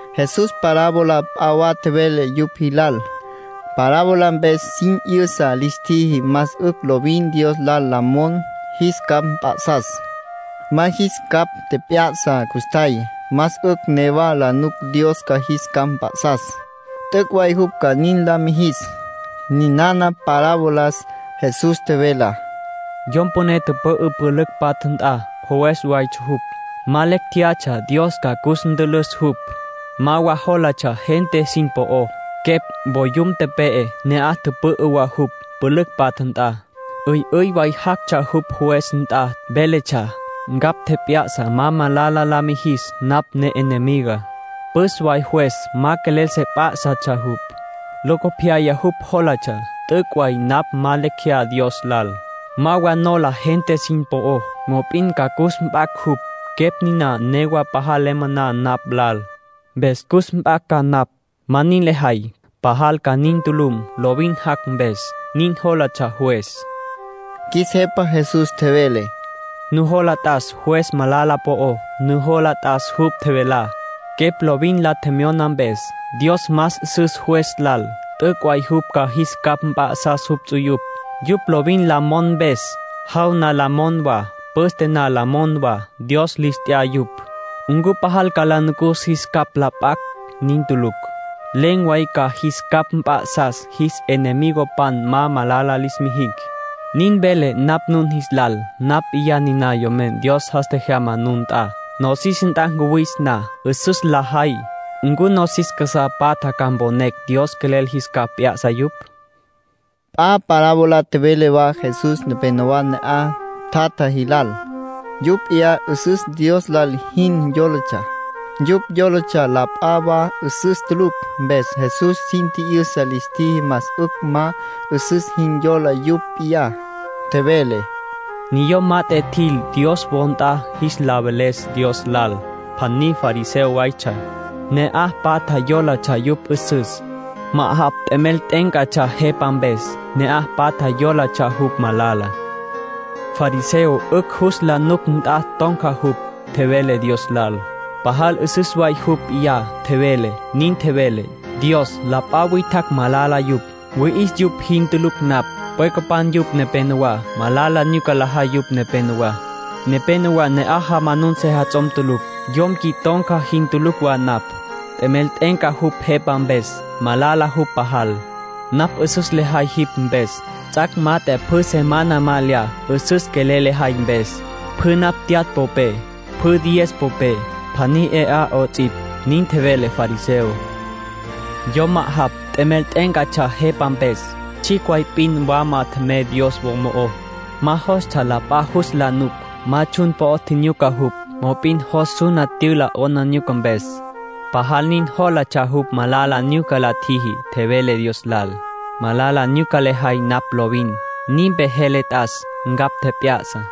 Jesús parábola p'a wa tjevele yupj jilal. Parábola mpes sin 'yüsa lis tjiji más 'ücj lovin Dios lal la mon jis capj mp'a'sas. Ma jis capj tjep'ya'sa custjay, más 'ücj newa la nuc Dios ca jis capj mp'a'sas. T'üc' way jupj ca nin la mijis. Ninana parabolas Jesús tjevelá: “Yom püné tüpü'ü pülücj patja nt'a. Juez waytsja jupj. Ma lecj jéyatsja Dios ca cus ntülüs jupj. Ma wa jólatsja gente sin po'ó. Quepj, voyum tepe'e, ne'aj tüpü'ü wa jupj, pülücj patja nt'a. 'Üy'üy way jactsja jupj juez nt'a, véletsja: ‘Ncapj tjep'ya'sa ma malala la ma jis napj ne'enemigá.’ Püs way juez ma quelel se p'á'satsja jupj. Locopyaya jupj jólatsja: ‘T'üc' way napj ma lecj jeyá Dios lal. Ma wa nola gente sin po'ó. Mop'in ca cus mp'acj jupj. Quepj niná newa pajal le moná napj lal, mpes cus mp'acj ca napj. Ma nin lejay, pajal ca nin tulum, lovin jac' mpes’, nin jólatsja juez.” Qjuis Jepa Jesús tjevele: “Nujola t'as juez malala po'ó. Nujola t'as jupj tjevelá, quepj lovin la tjemyona mpes. Dios más 'üsüs juez lal. T'üc' way jupj ca jis capj mp'a'sas jupj ts'uyupj, yupj lovin la mon mpes, jaw na la mon wa, püste na la mon wa. Dios lis t'ya yupj. ¿Ncu pajal ca la nucus jis capj la p'acj? Nin tulucj. Len̈ way ca jis capj mp'a'sas, jis enemigopan ma malala lis mijicj. Nin velé napj nun jis lal. Napj p'iyá niná Yomen Dios jas tjejyama nun nt'a. Nosis nt'a cuwis na 'üsüs la jay ¿ncu nosis casá patja ca mponecj Dios quelel jis capj p'ya'sa yupj?” nin tjevele Jesús. P'a parábola tjevele wa Jesús nepénowa ne'aj tjatja jilal. Yupj p'iyá 'üsüs Dios lal jin yólatsja. Yupj yólatsja la p'a wa 'üsüs tulucj. Mpes Jesús sin tji'yüsa lis tjiji más 'ücj ma 'üsüs jin yola yupj p'iyá. Tjevele: “Niyom mat'e tjil Dios wo nt'a jis la veles Dios lal. Pjaní fariseo waytsja. (Ne'aj patja yólatsja jupj 'üsüs.) Ma'ajapj t'emel t'e'éncatsja jepa mpes. (Ne'aj patja yólatsja jupj malala.) Fariseo 'ücj jus la nuc nt'a ton̈ca jupj, tjevele Dios lal. (Pajal 'üsüs way jupj p'iyá, tjevele.) Nin tjevele: ‘Dios, la p'a witjacj malala yupj. Wüi'is yupj jin tulucj napj. Pwecapan yupj nepenowá. Malala nyuca lajay yupj nepenowá. Nepénowa ne'aj jamanun sejats'om tulucj. Yom qui ton̈ca jin tulucj wa napj. T'emel t'e'enca jupj jepa mpes. (Malala jupj pajal.) Napj 'üsüs lejay jipj mpes. Ts'ac' mat'e pjü semana ma lya, 'üsüs quelel lejay mpes. Pjü napj tyatj popé, pjü diez popé, pjaní 'e 'a 'ots'ipj.’ Nin tjevele fariseo. ”Yom ma'ajapj, t'emel t'e'éncatsja jepa mpes. Tsjicj way p'in wama tjemey Dios wo mo'ó. Ma jostsja la p'a jus la nuc. Ma tsjun po'o tjinyuca jupj. Mop'in jos suna tyüla 'aplijila mpes. Pajal nin jólatsja jupj malala nyuca la tjiji. Tjevele Dios lal: ‘Malala nyuca lejay napj lovin. Ninpe jele t'as. Ncapj tjep'ya'sa.’”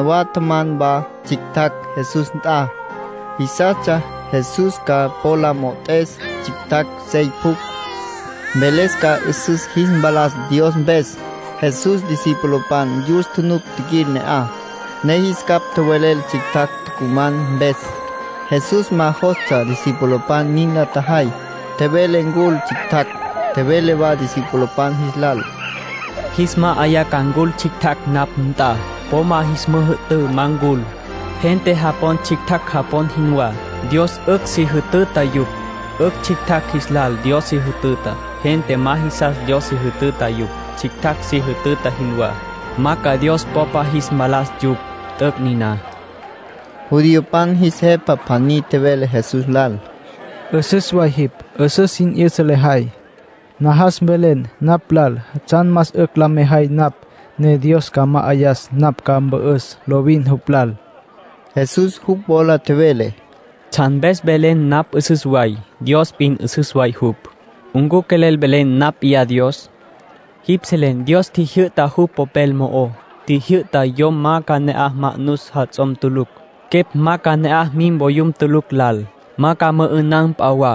Nepénowa tjaman wa tsjictjacj Jesús nt'a. Jisastsja Jesús ca po la mo'ot'es tsjictjacj sey pjucj, mveles ca 'üsüs jis mpalas Dios mpes. Jesús discipulopan yus tjunuc tjiquil ne'aj, ne jis capj tjowelel tsjictjacj tucuman mpes. Jesús ma jostsja discipulopan nin la tjajay. Tjevele ncul tsjictjacj. Tjevele wa discipulopan jis lal: “Jis ma'ayá ca ncul tsjictjacj napj nt'a. Po ma jis müjü'tǘ ma ncul. Gente japon tsjictjacj japon jinwá, Dios 'ücj si jütüta yupj. 'Ücj tsjictjacj jis lal Dios si jütüta. Gente ma jisas Dios si jütüta yupj, tsjictjacj si jütüta jinwá, ma ca Dios popa jis mpalas yupj. T'üc' niná”, tjevele Jesús. Judiopan jis jepa pjaní tjevele Jesús lal: —'Üsüs way jipj. 'Üsüs sin 'yüsa lejay. Najas mvelen napj lal tsjan más 'ücj la mejay napj ne Dios ca ma'ayas napj ca 'ücj mpü'üs lovin jupj lal. Jesús jupj wola tjevele: —¿Tsjan mpes tjevelen napj 'üsüs way? Dios p'in 'üsüs way jupj. (¿Ncu quelel velen napj p'iyá Dios?) Jipj selen Dios tjijyü'tá jupj Popel mo'ó. Tjijyü'ta yom ma ca ne'aj ma'nus jats'om tulucj, quepj ma ca ne'aj mim voyum tulucj lal, ma ca mü'ü'nan p'a wa,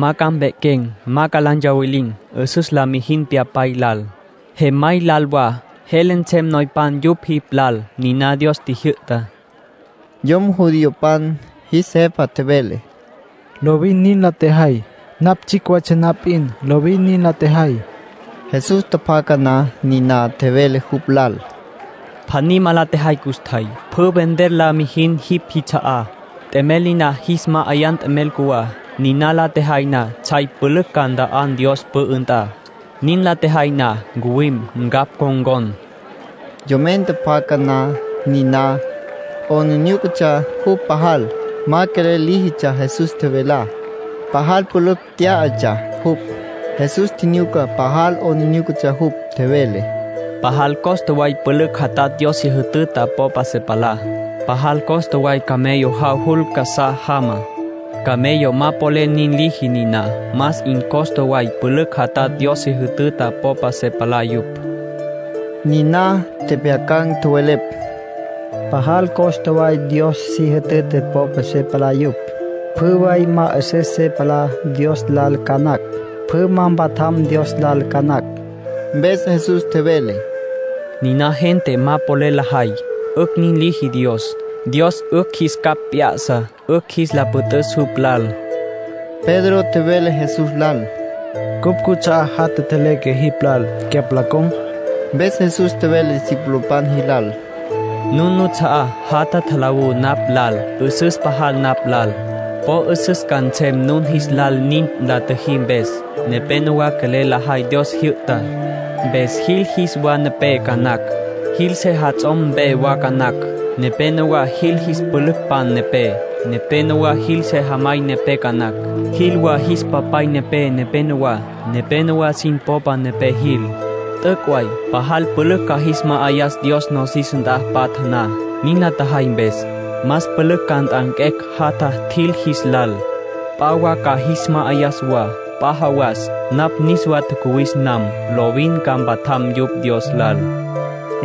ma ca mpequem, ma la ntsawilin. 'Üsüs la mijin pyapay lal, jemay lal wa. Jele nsem noypan yupj jipj lal. Niná Dios tjijyü'tá —tjevele Jesús. Yom judiopan jis jepa tjevele: —Lovin nin la tjejay. Napj tsjicj waytsja na p'in lovin nin la tjejay. Jesús tjapjaca na niná, tjevele jupj lal: —Pjaní ma la tjejay custjay. Pjü vender la mijin jipj jits'a'á. T'emel niná jis ma'ayan t'emel cjuwá. Nin la tjejay na tsjay pülücj ca nta'an Dios pü'ü nt'a. Nin la tjejay na ncuwim, ncapj ncon̈con. Yomen tjapjaca na niná, 'aplijílatsja jupj pajal. Ma quelel líjitsja Jesús tjevelá. Pajal pülücj tyá'atsja jupj. Jesús tjinyuca pajal 'aplijílatsja jupj. Tjevele: —Pajal costa way pülücj jatatj Dios si jütüta popa se palá. Pajal costa way camello jav jul casá jama. Camello ma polel nin liji niná. Más 'in costa way pülücj jatatj Dios si jütüta popa se palá yupj —tjevele Jesús. Niná tjepjyacan̈ tjowelepj: —Pajal costa way Dios si jütüta popa se palá yupj. Pjü way ma 'üsüs se palá Dios lal ca nacj, pjü ma mpatjam Dios lal ca nacj. Mpes Jesús tjevele: —Niná gente ma polel lajay, 'ücj nin liji Dios. Dios 'ücj jis capj p'ya'sa 'ücj jis la püt'üs jupj lal. Pedro tjevele Jesús lal: —Cupj cuts'a'á jatja tjeleque jipj lal, cyapj la con̈. Mpes Jesús tjevele discipulopan jilal: —Nun nuts'a'á jatja tjalawú napj lal, 'üsüs pajal napj lal. Po 'üsüs ca nsem nun jis lal nin la tjüjí mpes. Nepénowa quelel lajay Dios jyü'tá, mpes jil jis wa nepé ca nacj, jil sejats'om mpe wa ca nacj. Nepénowa jil jis pülücpan nepé. Nepénowa jil sejamay nepé ca nacj. Jil wa jis papay nepé nepenowá. Nepénowa sin popa nepé jil. T'üc' way pajal pülücj ca jis ma'ayas Dios nosis nt'a patja na, nin la tjajay mpes. Más pülücj ca nt'anquecj jatja tjil jis lal. P'a wa ca jis ma'ayas wa. P'a jawas, napj niswa tjacuwis nam, lovin ca mpatjam yupj Dios lal —tjevele Jesús.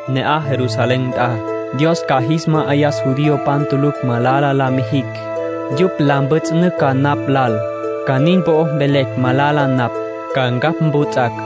Ne'aj Jerusalén nt'a, Dios ca jis ma'ayas judiopan tulucj malala la ma jicj. Yupj la mpjüts'ünücj ca napj lal. Ca nin po'o mvelecj malala napj. Ca ncapj mputs'acj.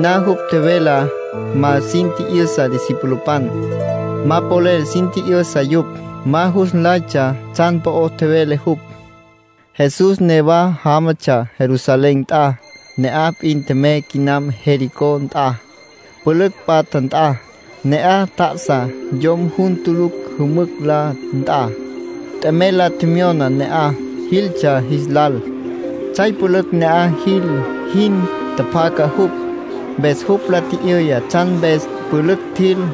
Niná jupj tjevelá ma sin tji'yüsa discipulopan. Ma polel sin tji'yüsa yupj. Ma jus nlaytsja tsjan po'o tjevele jupj. Jesús newa jámatsja Jerusalén nt'a. Ne'aj p'in tjemey quinam Jericó nt'a, pülücj patja nt'a. Ne'aj tjá'asa yom jun tulucj jümücj la nt'a. T'emel la tjemyona ne'aj jiltsja jis lal. Tsjay pülücj ne'aj jil jin tjapjaca jupj, mpes jupj la tji'yüya tsjan mpes pülücj tjil.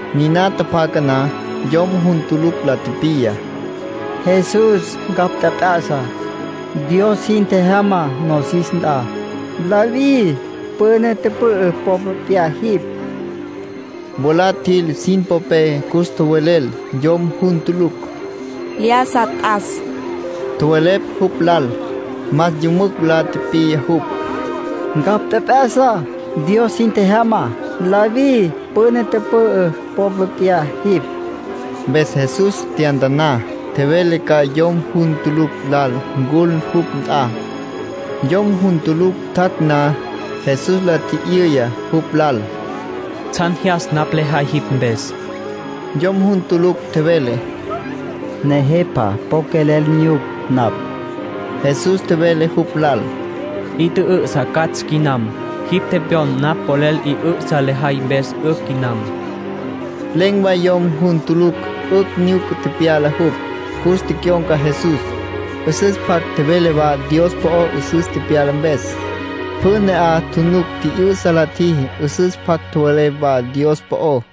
Niná tjapjaca na, yom jun tulucj la tipiya: —Jesús, ncapj tjep'ya'sa. Dios jin tjejyama nosis nt'a. David püna tüpü'ü popa p'iyá jipj. Mwalá tjil sin popé cus tjowelel yom jun tulucj. —Lyájasa t'as —tjowelepj jupj lal. Más yümücj la tipiya jupj: —Ncapj tjep'ya'sa. Dios jin tjejyama. David püna tüpü'ü popa p'iyá jipj. Mpes Jesús tyantaná, tjevele ca yom jun tulucj lal ncul jupj nt'a. Yom jun tulucj tjac' na, Jesús la tji'yüya jupj lal: —¿Tsjan jyas napj lejay jipj mpes? Yom jun tulucj tjevele: —Nejepa, po quelel nyuc napj. Jesús tjevele jupj lal: —'I tjü'ü'sa catsj quinam. Jipj tepyon napj polel 'i 'ü'sa lejay mpes 'ücj quinam. Len̈ way yom jun tulucj 'ücj nyuca tepyala jupj. Cus tecyon̈ca Jesús, 'üsüs pjac tjevele wa Dios po'ó 'üsüs tepyala mpes. Pjü ne'aj tjunuc tji'yü'sa la tjiji, 'üsüs pjac tjowelepj wa Dios po'ó.